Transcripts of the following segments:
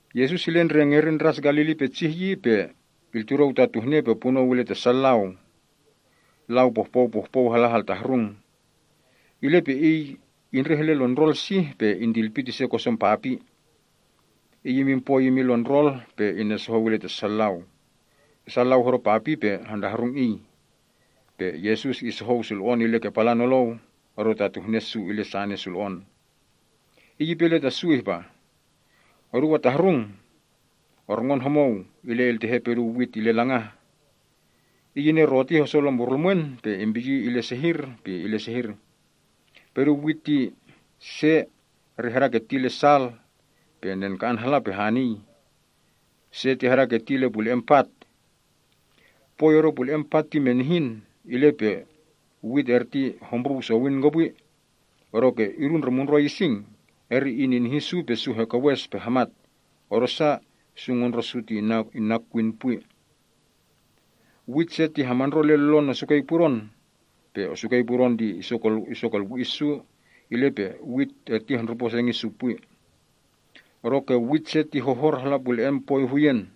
Yesus ile ngerin Ndras Galili petsih yi, pe iltudou tatuhne pe punou ile ta sa lau. Lau pohpou pohpou hala haltahrung. Ile pe Iy indreh ile lon ndrol sih, pe intilpit ise koson papi. Iy imin poi imin lon ndrol pe inesohou ile ta sa lau. Sa lau hodo papi pe hantahrung Iy. Pe Yesus isohou sulo‑on ile ke palan nolou odo tatuhne su ile sane sulo‑on. Iy ipe ile ta su ihpa, “Oduu atahrung! Orngon homou ile iltehe pedun wit ile langah. Iy ineroti hoso lompurlumwen pe impiyi ile sehir pe sehir. Pedun wit se ti hadaketi hala sal, pe nenka‑an hala pe hanii. Se ti hadaketi hala pule‑en pat. Poi odo pule‑en pat ti menihin, ile pe wit erti hombruu sowin kopwi. Odoke idu ndre mundroi ising, eri ininihi su pe su hekewes pe hamat, odosa su ngondro’ su hana kwin pwi. Wit se ti hamandro hala lon esukei pudon. Pe esukei pudon hosomali su, ile pe su hendrupo sengi’ su pwi. Odoke wit se ti horor hala pule‑en poi huyen.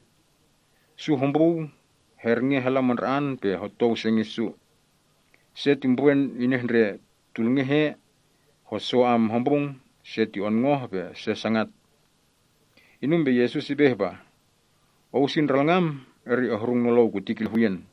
Su hombruu, hernge hala mandra‑an pe hotou sengi’ su. Se ti mbrwe’ su inehndre tulngeh ea hoso hombrung, se onngoh, pe se sangat.” Inum pe Yesus ipe ihpa, “Ou si ndralngam eri ohrung nolou kuti kehii.”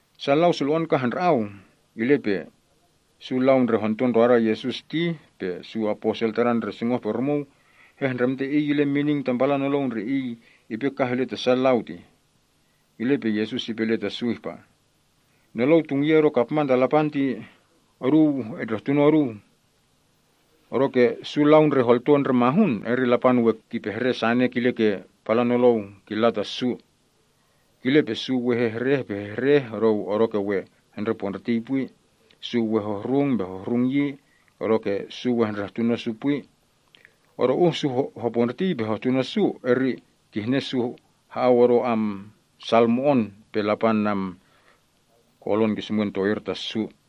Sa lau sulo‑on kah handra‑au. Ile pe su lau ndre honto ndroda Yesus ti, pe su aposel Tadan ndre sungoh-pe-rumuu, hehndremte Iy ile mining tam palan nolou ndre Iy indripa kah ile ta sa lau tih. Ile pe Yesus ipe ile ta su ihpa, “Nolou tungye odo kapman ta Lapan ti oduu etndrehtuno oduu. Odoke su lau ndre holto ndre mahun, eri Lapan we kimpehre sane kile ke palan nolou killa ta su. Kile pe: “‘Su we hehreh pe hehreh odoke we hendrepondriti pwi, su we hehrung pe hehrung yi, odoke su we hendrehtuno su pwi. Odo uh su hopondritii pe hehtuno su, eri kihne su ha‑au odo sal mo‑on pe Lapan ki‑es to‑ir ta su ha‑au.’”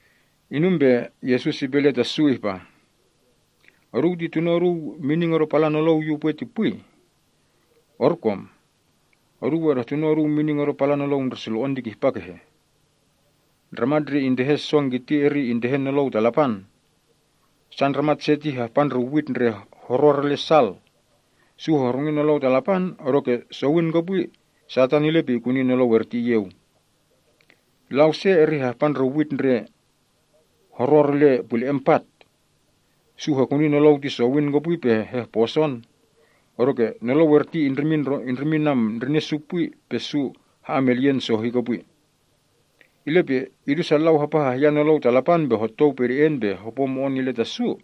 Inum pe Yesus ipe ile ta su ihpa, “Oduu ti tuno’ oduu mining odo palan nolou yu upwe ti pwi? Orkom! Oduu we edehtuno oduu mining odo palan nolou ndre sulo‑on ti kihpa kehe? Ndramat ndre intehe song kiti eri intehe Nolou ta Lapan. Sa ndramat se ti hahpa ndre wit ndre horor hala sal. Su hehrungi Nolou ta Lapan, odoke sowin kopwi Satan ile pe ikuni nolou erti iyeu. Lau se eri hahpa ndre wit ndre horor ile pule‑en pat. Su hekuni nolou ti sowin kopwi pe hehposon. Odoke nolou erti indrimin ndrine’ su pwi pe su ha‑amelyen sohi kopwi. Ile pe idu sa lau hapa hahyan Nolou ta Lapan pe hotou pede‑en pe hopo mo‑on ile ta su,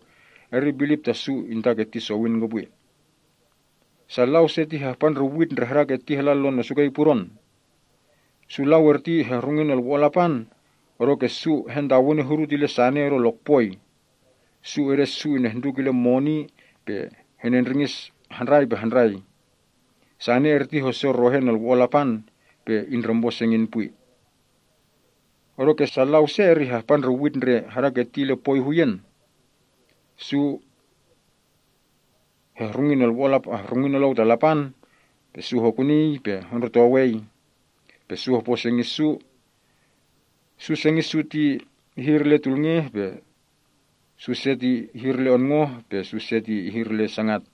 eri bilip ta su intaketi sowin kopwi. Sa lau se ti hahpa ndre wit ndre hadaketi hala lon osukei pudon. Su lau erti hehrungi Nolwo‑on Lapan odoke su hantewene hudut ile sane odo lokpoi. Su ede’ su inehnduk ile moni pe henendringis handrai pe handrai. Sane erti hosorohe Nolwo‑on Lapan, pe indrempo sengin pwi. Odoke sa lau se eri hahpa ndre wit ndre hadaketi ile poi huyen. Su hehrungi Nolou ta Lapan, su hokunii, pe hondrotowei. Pe su hopo sengi’ su. Su se sengi’ su ihir ile tulngeh, su se onngoh, pe su se ihir ile sangat.”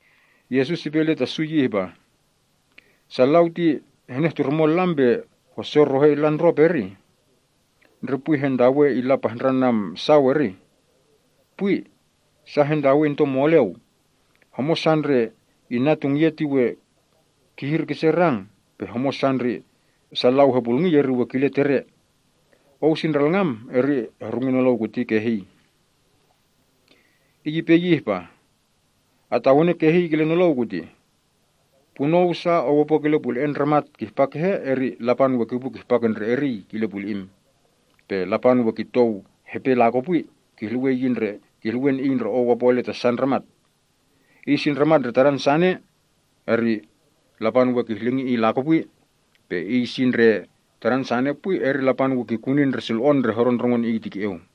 Yesus ipe ile ta su yi ihpa, “Sa lau ti henehturmon lam pe hosorohe ile ndrop, erih? Ndre pwi hantawe ile pahndran sau, erih? Pwi! Sa hentawe into moleu. Homosa ndre inna tungye ti we kihir kise rang. Pe homosa ndre sa lau hepulngi, eri we kile tere. Ou si ndralngam, eri ehrungi nolou kurti kehii.” Iy ipe yi ihpa, “Atawene kehii kile nolou kutih. Punou sa ou opo kile pule‑e’ si ndramat kihpa kehe eri Lapan we kipu kihpa ke ndre eriy kile puli‑im. Pe Lapan we kitou hepe lakopwi, kihluwen iy ndre ou opo ile ta sa ndramat. Iy si ndramat ndre tadan sane, eri Lapan we kihngahang iy lakopwi. Pe iy si ndre tadan sane pwi, eri Lapan we kikuni ndre sulo‑on ndre hodo ngon iy ti ke‑eu.”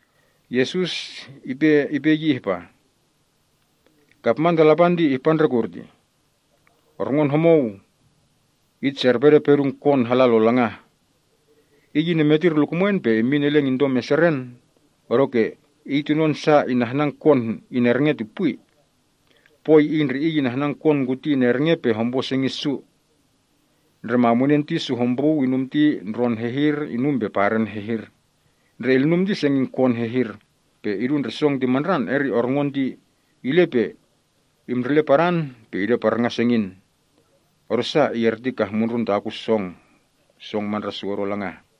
Yesus ipe yi ihpa, “Kapman to Lapan ti ihpa ndre kurtih: Orngon homou itserpede pedun wit hala lo langah. Iy inemetir lukumwen pe immin eleng into meseren, odoke iy tunon sa inahnan wit henerenge ti pwi. Poi iy ndre iy inahnan wit kuti henerenge pe hompo sengi’ su. Ndremanunen ti su hombruu, inum ti ndron hehir, inum pe paren hehir. Ndre ilnum ti sengin wit hehhir. Pe idu ndre song ti mandran, eri orngon ti ile pe imndrele padan pe ideparngan sengin. Odosa iy eti kah mundrun takun song mandran odo langah.”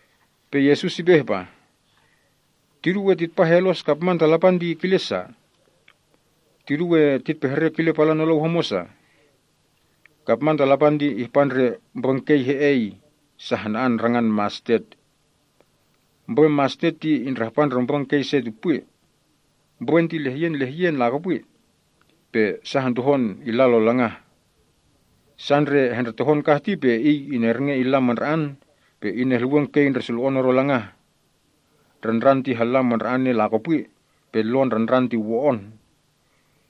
Pe Yesus ipe yi ihpa, “Tidu we titpahelos kapman ta Lapan ti kile sa? Tidu we titpehre kile palan nolou sa? Kapman ta Lapan ti ihpa ndre mbrwen kei he‑ei sa hana‑an, rangan mastet. Mbrwen mastet ti indrahpa ndre mbrwen kei se ti pwi. Mbrwen ti lehyen lehyen lakopwi. Pe sa hentohon illa lo langah. Sa ndre hendretohon kah ti pe iy inerenge, pe inehluwen kei ndre sulo‑on odo langah. Ndrandran ti halla mandra‑ane, pe lon ndrandran ti wo‑on.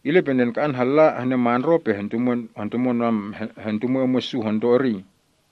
Ile pe nenka‑an halla henemandro pe hentumwe emwe’ su honto eriy.”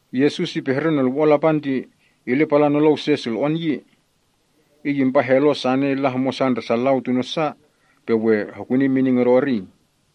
Yesus ipehre Nolwo‑on Lapan ti ile palan nolou se sulo‑on yi. Iy impahelos sane illa homosa ndre sa lau tuno’ sa, pe we hanon hokuni mining odo eriy tih.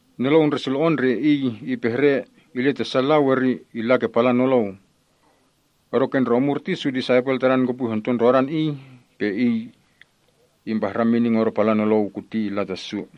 Nolou ndre sulo‑on ndre Iy ipehre ile ta sa lau, eri illa ke palan nolou. Odoke ndre omur ti su disaipel Tadan kopwi honto ndrodan Iy, pe Iy impahran mining odo palan nolou kuti hala ta su.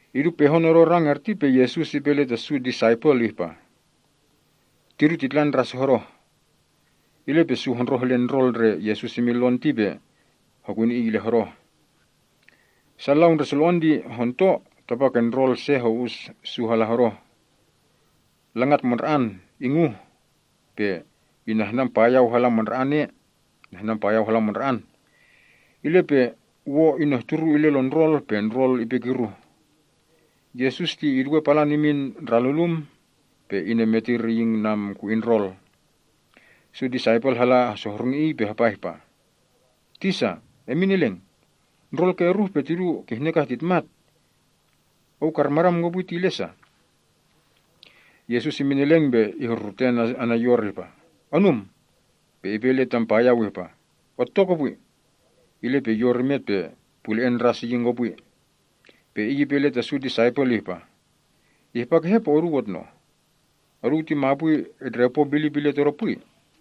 Idu pehon odo rang erti pe Yesus ipe ile ta su disaipel ihpa, “Tidu titla ndras hodoh.” Ile pe su hondroh ile ndrol ndre Yesus imin lon ti pe hokuni Iy ile hodoh. Sa lau ndre sulo‑on ti honto, tapake ndrol se ho‑us su hala hodoh. Langat mandra‑an inguh pe ihnan payau hala mandra‑an, ile pe wo inehturu ile lon ndrol, pe ndrol ipe kiruh. Yesus ti iduwe palan imin ndralulum pe inemetir imin ku‑in ndrol. Su disaipel hala hesohrungi Iy pe hapa ihpa, “Tisa, emin eleng! Ndrol ke iruh pe tidu kihne kah titmat. Ou karmadam kopwi ile sa?” Yesus imin eleng pe ihrurute ana’ yor ihpa, “Onum!” pe ipe ile tam payau ihpa, “Otto kopwi!” Ile pe yor imet pe pule‑en ndras iyeweh. Pe Iy ipe ile ta su disaipel ihpa, “Ihpa kehe pe oduu otnoh? Oduu ti mapwi etndrempo bilip ile Todo pwi?”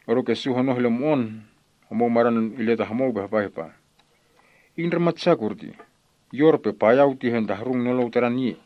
Odoke su honoh ile mo‑on. Homou madan ile ta homou pe hapa ihpa, “Iy ndramat sa kurtih? Yor pe payau ti hentahrung nolou Tadan yi!”